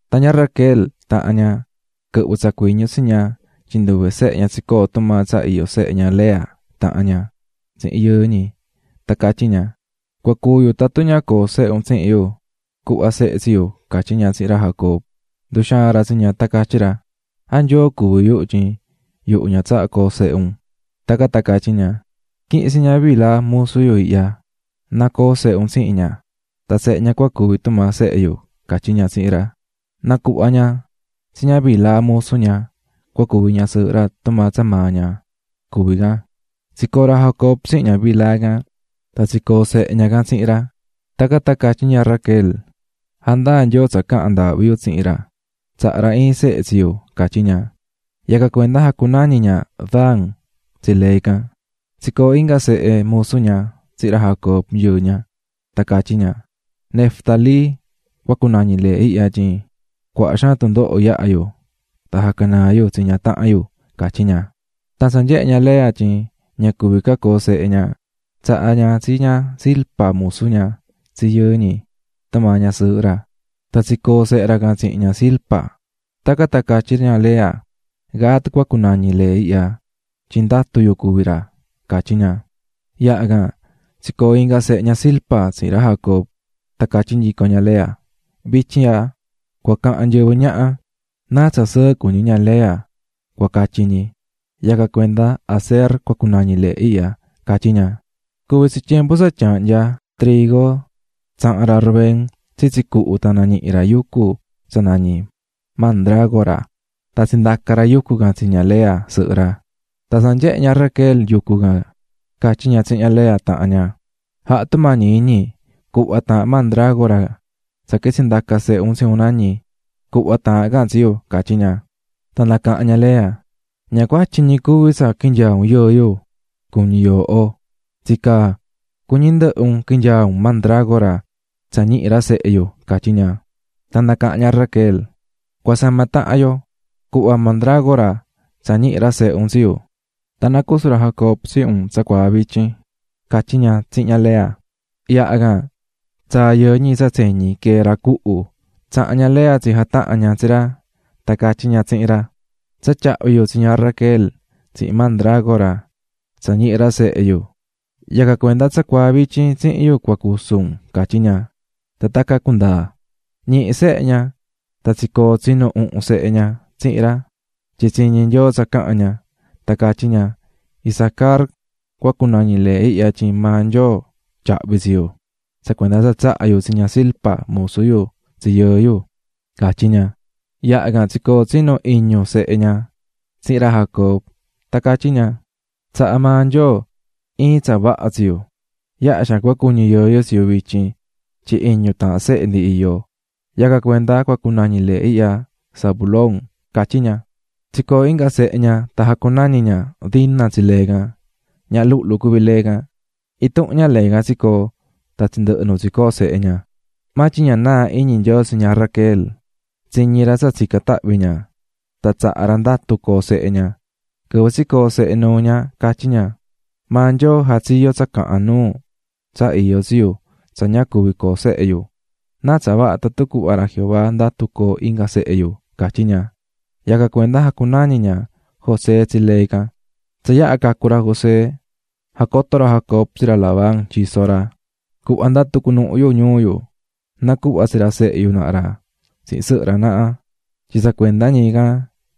Tan ña Raquel, tahan ña, quɨhvɨ̱ tsa cuiñu tsi ña tyin nduve sehe ña tsicoó tumaa tsa iyó sehe ña Lea, tahan ña, tsihin yɨɨ ñi, tan catyí ña: --Cua cúu yu tatun ña coo sehe un tsihin yu, cu̱hva sehe yu ―catyí ña tsihin ra Jacob. Nduxaa̱n ra tsi ña tan catyí ra: --¿A Nyoo cuví yuhu, tyin yuhu ña tsahá coo sehe un? Tacan tan catyí ña: --Qui̱hin tsi ña Bilha musu yu ihya, na co̱o sehe un tsihin ña, tan sehe ña cua cuvi tumaa sehe yu ―catyí ña tsihin ra. Nacuhva̱ ña tsi ña Bilha musu ña, cua cuvi ñasɨɨhɨ ra tumaa tsa maa ña cuví can, tsicoo̱ ra Jacob tsihin ña Bilha can. Tan tsicoo̱ sehe ña tsihin ra. Tacan tan catyí ña Raquel: "Jandaa̱ Nyoo tsa caha̱n ndaahvi yu tsihin ra, tsaha̱ ra iin sehe yu", catyí ña. Yacan cuenda jacunañi̱ ña Dan tsi lee can. Tsicoo̱ inga sehe musu ña tsihin ra Jacob, yɨɨ ña. Tan catyí ña: "Neftalí cua cunañi lee ihya, tyin cuaha xaan tundoho yaha̱ yu tan jacanaa̱ yu tsi ña tahan yu", catyí ña. Tan tsa nyehe̱ ña Lea tyin ña cuví ca coo sehe ña, tsaha̱ ña tsi ña Zilpa, musu ña tsi yɨɨ ñi, tumaa ñasɨɨhɨ ra. Tan tsicoo̱ sehe ra can tsihin ña Zilpa. Tacan tan catyí ña Lea: "Gad cua cunañi lee ihya tyin ndatu yu cuví ra", catyí ña. Yaha can tsicoo̱ inga sehe ña Zilpa tsihin ra Jacob. Tan catyí nyico ña Lea: "Vityin ihya, cua cahan nyɨvɨ ñaha: ¡Náa tsa sɨɨ cuñí ña Lea! cua catyi ñi, yacan cuenda Aser cua cunañi lee ihya", catyí ña. Cuvi̱ tsi tyembu tsa tyaahnyá trigo tsaha̱n ra Rubén tsitsi cuhu tan nañihi̱ ra yucu tsa nañí mandrágoraf6 tan tsindaca̱ ra yucu can tsi ña Lea, sɨhɨ ra. Tan tsa nyehe̱ ña Raquel yucu can catyí ña tsihin ña Lea tahan ña: --Ja̱ha tumañi iñi cu̱hva taahan mandrágora tsa quitsi̱ ndaca̱ sehe un tsi un nañi catsi yu --catyí ña. Tan nacaha̱n ña Lea: --¿Ña cuatyi ñi cuví tsa quinyaa̱ un yɨɨ yu, cuñí un, tsicaa, cuñí ndɨhɨ un quinyaa un mandrágora tsa ñihi̱ ra sehe yu? ―catyí ña. Tan nacaha̱n ña Raquel: --Cua sama tahan yo, cu̱hva mandrágora tsa ñihi̱ ra sehe un tsi yu, tan na cusu ra Jacob tsihin un tsacuaa vityin ―catyí ña tsihin ña Lea. Yaha can tsaa̱ yɨɨ ñi tsa tseñi quee̱ ra cuhu, tsaha̱n ña Lea tsijataha̱n ña tsi ra, tan catyí ña tsihin ra: --Tsa tyahvi̱ yu tsi ña Raquel tsihin mandrágora tsa ñihi̱ ra sehe yu. Yacan cuenda tsacuaa vityin tsihin yu cua cusu un ―catyí ña. Tan tacan cundaa̱. Ñihi̱ sehe ña tan tsicoo̱ tsinu uhun sehe ña tsihin ra, tyin tsiñi̱ Nyoo tsa caha̱n ña. Tan catyí ña: "Isacar cua cunañi lee ihya tyin maa Nyoo tyahvi̱ tsi yu tsa cuenda tsa tsaha̱ yu tsi ña Zilpa, musu yu, tsi yɨɨ yu", catyí ña. Yaha can, tsicoo̱ tsinu iñu sehe ña tsihin ra Jacob. Tan catyí ña: "Tsaha̱ maa Nyoo iin tsa vaha tsi yu, yaha xaan cua cuñi yɨɨ yu tsi yu vityin, tyin iñu taahan sehe ndi iyó. Yacan cuenda cua cunañi lee ihya Zabulón", catyí ña. Tsicoo̱ inga sehe ña tan jacunañi̱ ña Dina tsi lee can, ñaha luhlu cuví lee can. Intuhun ña lee can tsicoo̱ tan tsindɨhɨ̱ nu tsicoó sehe ña. Maa tyin ña naa̱ iñi Nyoo tsi ña Raquel, tsiñi̱ ra tsa tsica̱n tahvi ña tan tsaha̱ ra ndatu coo sehe ña. Quɨvɨ tsicoo̱ sehe nuu ña catyí ña: "Maa Nyoo jatsiyo̱ tsa cahan nuu tsa iyó tsi yu tsa ña cuví coo sehe yu, náa tsa vaha tatun cuhva ra Jehová ndatu coo inga sehe yu", catyí ña. Yacan cuenda jacunañi̱ ña José tsi lee can. Tsa yaha cacu̱ ra José, jacoto̱ ra Jacob tsi ra Labán, tyiso ra: --Cu̱hva ndatu cunuhun yu ñuu yu. Na̱cuhva tsi ra sehe yu naha ra tsihin sɨhɨ ra naha, tyin tsa cuenda ñi can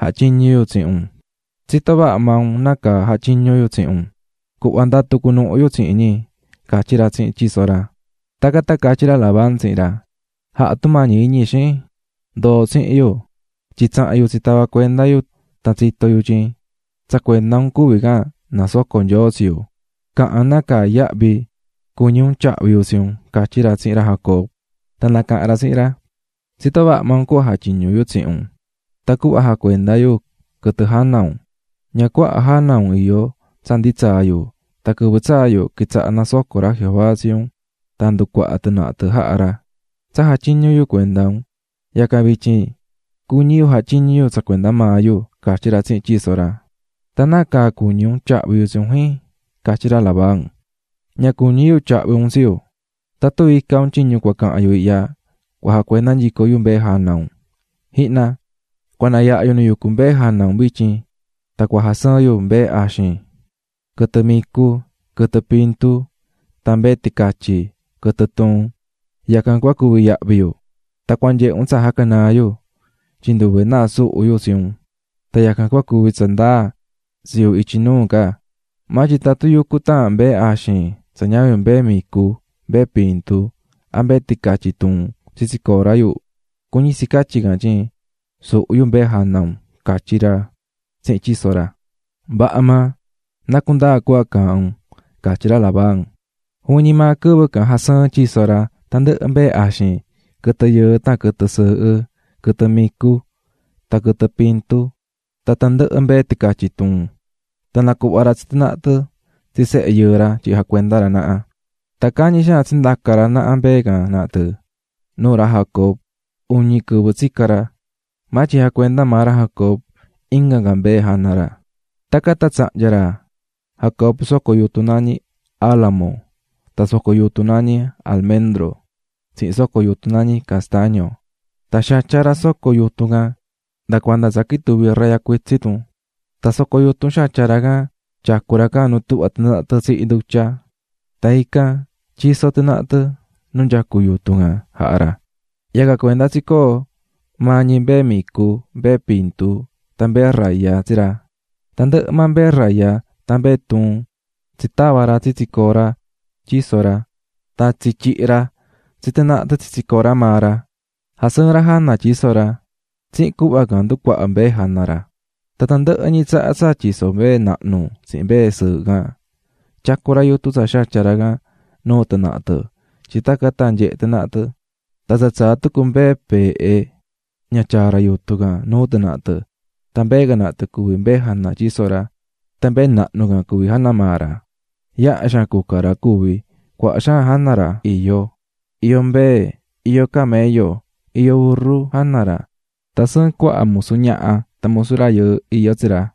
jatyiñu̱ yu tsihin un, tsitó vaha maa un nácaa jatyiñu̱ yu tsihin un. Cu̱hva ndatu cunuhun yu tsihin ñi --catyí ra tsihin tyiso ra. Tacan tan catyí ra Labán tsihin ra: --Ja̱ha tumañi iñi, xin, ndo̱o tsihin yu, tyin tsaha̱n yu tsitava̱ cuenda yu tan tsito̱ yu tyin tsa cuenda un nasocó Nyoo tsi yu. Ca̱han nácaa yahvi cuñí un tyahvi yu tsi un --catyí ra tsihin ra Jacob. Tan nacaha̱n ra tsihin ra: --Tsitó vaha maa un cuhva jatyiñú yu tsihin un tan cuhva jacuendá yu quɨtɨ jana un, ña cuaha jana un iyó tsa ndi tsaa̱ yu tan quɨvɨ tsaa̱ yu quitsaha̱ nasocó ra Jehová tsi un tan nducuaha̱ tɨ naha tɨ jaha̱ ra. Tsa jatyiñu̱ yu cuenda un, yacan vityin cuñí yu jatyiñu yu tsa cuenda maa yu ―catyí ra tsihin tyiso ra. ―Tan ¿nácaa cuñí un tyahvi yu tsi un, jin? ―catyí ra Labán. --Ña cuñí yu tyahvi un tsi yu. Tatun ica un tyiñu cua cahan yu ihya, cua jacuenda nyico yu mbee jana un. Ji̱hna, cua nayaha yu nu yucú mbee jana un vityin tan cua jasɨɨn yu mbee axin, quɨtɨ micu, quɨtɨ pintu tan mbee ticatyi, quɨtɨ tuun, yacan cua cuvi yahvi yu. Tan cua nyehe un tsa jacanaa̱ yu, tyin nduve náa suhu̱ yu tsi un tan yacan cua cuvi tsa ndaa tsi yu ityi nuu ca. Maa tyin tatun yucú taahan mbee axin tsa ñavin mbee micu, mbee pintu a mbee ticatyi tuun tsitsi cora yu, cuñí tsi catyi can tyin, suhu̱ yu mbee jana un --catyí ra tsihin tyiso ra. --Vaha maa, na cundaa cuhva caahán un ―catyí ra Labán. Juvin ñi maa quɨvɨ can jasɨɨ̱n tyiso ra tandɨhɨ mbee axin, quɨtɨ yɨɨ tan quɨtɨ sɨɨhɨ, quɨtɨ micu tan quɨtɨ pintu tan tandɨhɨ mbee ticatyi tuun, tan nacuhva̱ ra tsi tɨ naha tɨ tsi sehe yɨɨ ra tyin jacuenda ra naha. Tan cañi xaan tsindaca̱ ra naha mbee can naha tɨ nuu ra Jacob, uñi quɨvɨ tsica̱ ra. Maa tyin jacuendá maa ra Jacob inga ca mbee jana ra. Tacan tan tsahnya̱ ra Jacob soco yutun nañí álamo tan soco yutun nañí almendro tsihin soco yutun nañí castaño, tan xatya̱ ra soco yutun can nda cuanda tsa quituvi̱ raya cuitsin tun. Tan soco yutun xatya̱ ra can tyacú ra can nu tuhvá tɨ naha tɨ tsihí ndutya, tan ican tyisó tɨ naha tɨ nu nyacú yutun can jaha̱ ra, yacan cuenda tsicoó maa ñi mbee micu, mbee pintu, tan mbee raya tsi ra. Tandɨhɨ maa mbee raya, tan mbee tuun tsitava̱ ra tsitsi cora tyiso ra tan tsityihi̱ ra tsi tɨ naha tɨ tsitsi cora maa ra, jasɨɨ̱n ra jana tyiso ra. Tsihin cuhva can nducuahá mbee jana ra. Tan tandɨhɨ ñi tsaha tsa tyisó mbee nahnu tsihin mbee sɨɨhɨ can, tyacú ra yutun tsa xatya̱ ra can nuu tɨ naha tɨ tyin tacan tan nyehe tɨ naha tɨ. Tan tsa tsaá tucu mbee peehe, ña tyaá ra yutun can nuu tɨ naha tɨ, tan mbee can naha tɨ cuví mbee jana tyiso ra tan mbee nahnu can cuví jana maa ra. Yaha xaan cuca ra cuvi̱, cuaha xaan jana ra iyó, iyó mbee, iyó camello, iyó urru jana ra tan sɨɨn cuaha musu ñaha tan musu rayɨɨ iyó tsi ra.